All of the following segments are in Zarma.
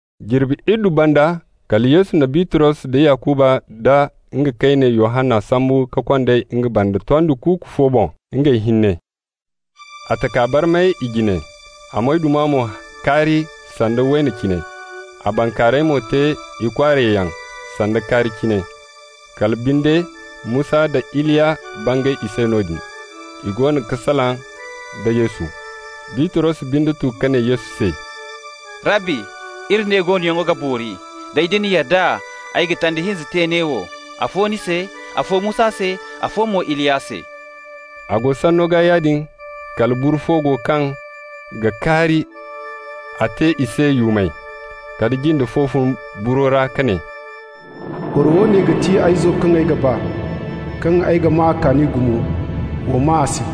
Jirbi iddu banda, kala Yesu na Bitros da Yakuba nda nga kayne Yohanna sambu ka kond'ey nga banda tondi kuuku fo boŋ, ngey hinne. A taka barmay i jine, a moyduma mo kaari sanda wayna cine, a bankaaray mo te ikwaarayyaŋ sanda kaari cine. Kala binde Musa nda Iliya bangay i se noodin. I goono ga salaŋ da Yesu. Bitros binde tu ka ne Yesu se: «Rabbi, iri ne goonoyaŋo ga boori. Day, da ni yadda, ay ga tanda hinza te neewo, afo ni se, afo Musa se, afo mo Iliya se.» A go sanno gaa yaadin, kala buru fo go kaŋ ga kaari, a te i se yuumay. Kala jinde fo fun buro ra ka ne: «Boro woone ga ti ay izo kaŋ ay ga ba, kaŋ ay ga maa a kaani gumo. Wa maa a se.»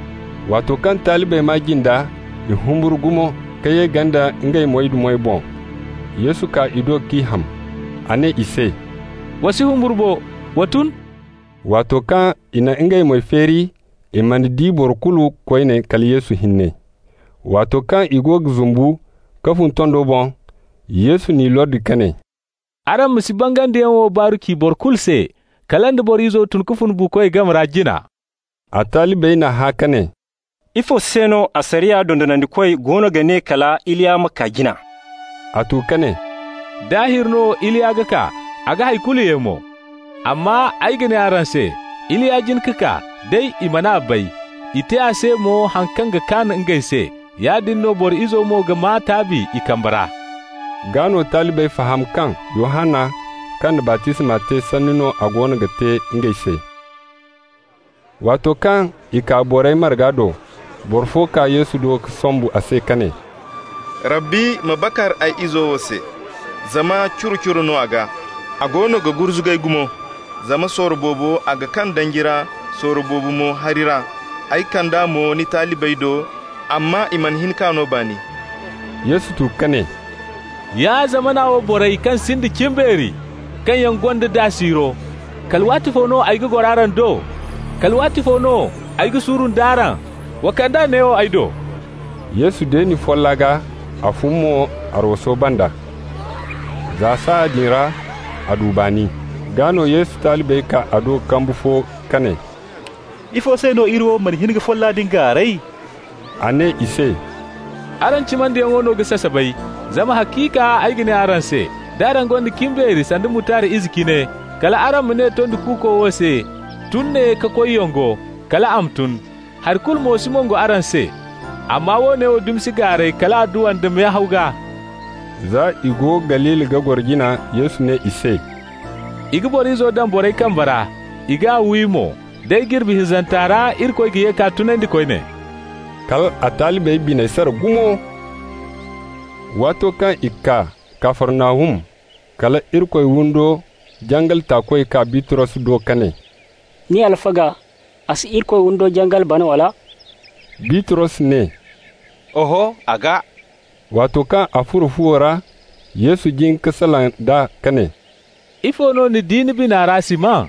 Waato kaŋ talibey maa jinda, i humburu gumo ka ye ganda ngey moydumey boŋ. Yesu kaa i do k'i ham. A ne i se: «Wa si humburu bo, wa tun.» Waato kaŋ i na ngey moy feeri, i mana di boro kulu koyne kala Yesu hinne. Waato kaŋ i go ga zumbu ka fun tondo boŋ, Yesu n'i lordi ka ne: «Araŋ ma si bangandiyaŋ wo baaru ci boro kulu se, kala nda Boro Izo tun ka fun buukoy game ra jina.» A talibey n'a hã ka ne: «Ifo se no asariya dondonandikoy goono ga ne kala Iliya ma kaa jina?» A tu ka ne: «Daahir no Iliya ga kaa, a ga hay kulu ye mo. Amma ay ga ne araŋ se: Iliya jin ka kaa, day i man'a bay, i te a se mo haŋ kaŋ kaan ngey se. Yaadin no Boro Izo mo ga maa taabi i kambe ra.» Gaa no talibey faham kaŋ Yohanna kaŋ na baptisma te sanni no a goono ga te ngey se. Waato kaŋ i kaa borey marga do, boro fo kaa Yesu do ka sombu a se ka ne: «Rabbi, ma bakar ay izo wo se, zama curo-curo no a gaa. A goono ga gurzugay gumo. Zama sorro boobo a ga kaŋ danji ra, sorro boobo mo hari ra. Ay kand'a mo ni talibey do, amma i mana hin k'a no baani.» Yesu tu ka ne: «Ya zamana wo borey kaŋ sinda cimbeeri, kaŋ yaŋ gonda daa siiro! Kala waatifo no ay ga goro araŋ do? Kala waatifo no ay ga suuru nd'araŋ? Wa kand'a neewo ay do.» Yesu deeni folla gaa, a fun mo arwaso banda. Za saaya din ra a du baani. Gaa no Yesu talibey kaa a do kambu fo ka ne: «Ifo se no iri wo mana hin ka folla din gaaray?» A ne i se: «Araŋ cimandiyaŋo no ga sasabay. Zama haciika ay ga ne araŋ se, d'araŋ gonda cimbeeri sanda mutard ize cine, kal araŋ ma ne tondi kuuko wo se: ‹Tun ne ka koy yongo› -- kal a ma tun. Hari kulu mo si mongo araŋ se. Amma woone dumi si gaaray kala adduwa nda mehaw gaa.» Za i go Galili ga goro jina Yesu ne i se: «I ga Boro Izo daŋ borey kambe ra. I g'a wi mo, day, jirbi hinzanta ra Irikoy ga ye k'a tunandi koyne.» Kal a talibey biney sara gumo. Waato kaŋ i kaa Kafarnahum, kala Irikoy windo jangal taakoy kaa Bitros do ka ne: «Ni alfaga, a si Irikoy windo jangal bana, wala?» Bitros ne: «Oho! A ga.» Waato kaŋ a furo fuwo ra, Yesu jin ka salaŋ nd'a ka ne: «Ifo no ni di ni bina ra, Siman?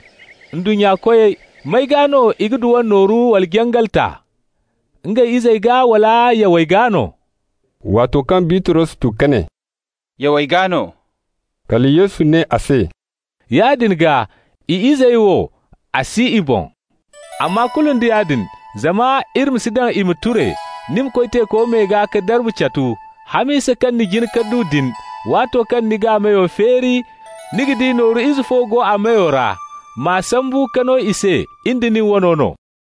Ndunnya koyey, may gaa no i ga dwan nooru wala jangal ta? Ngey izey gaa, wala yawey gaa no?» Waato kaŋ Bitros tu ka ne: «Yawey gaa no,» kala Yesu ne a se: «Yaadin gaa, i izey wo, a si i boŋ. Amma kulu nda yaadin, zama iri ma si daŋ i ma ture, ni ma koy teeko me gaa ka darbu catu. Hamisa kaŋ ni jin ka du din, waato kaŋ ni g'a meyo feeri ni ga di nooru ize fo go a meyo ra. M'a sambu ka no i se, in da nin wano no.»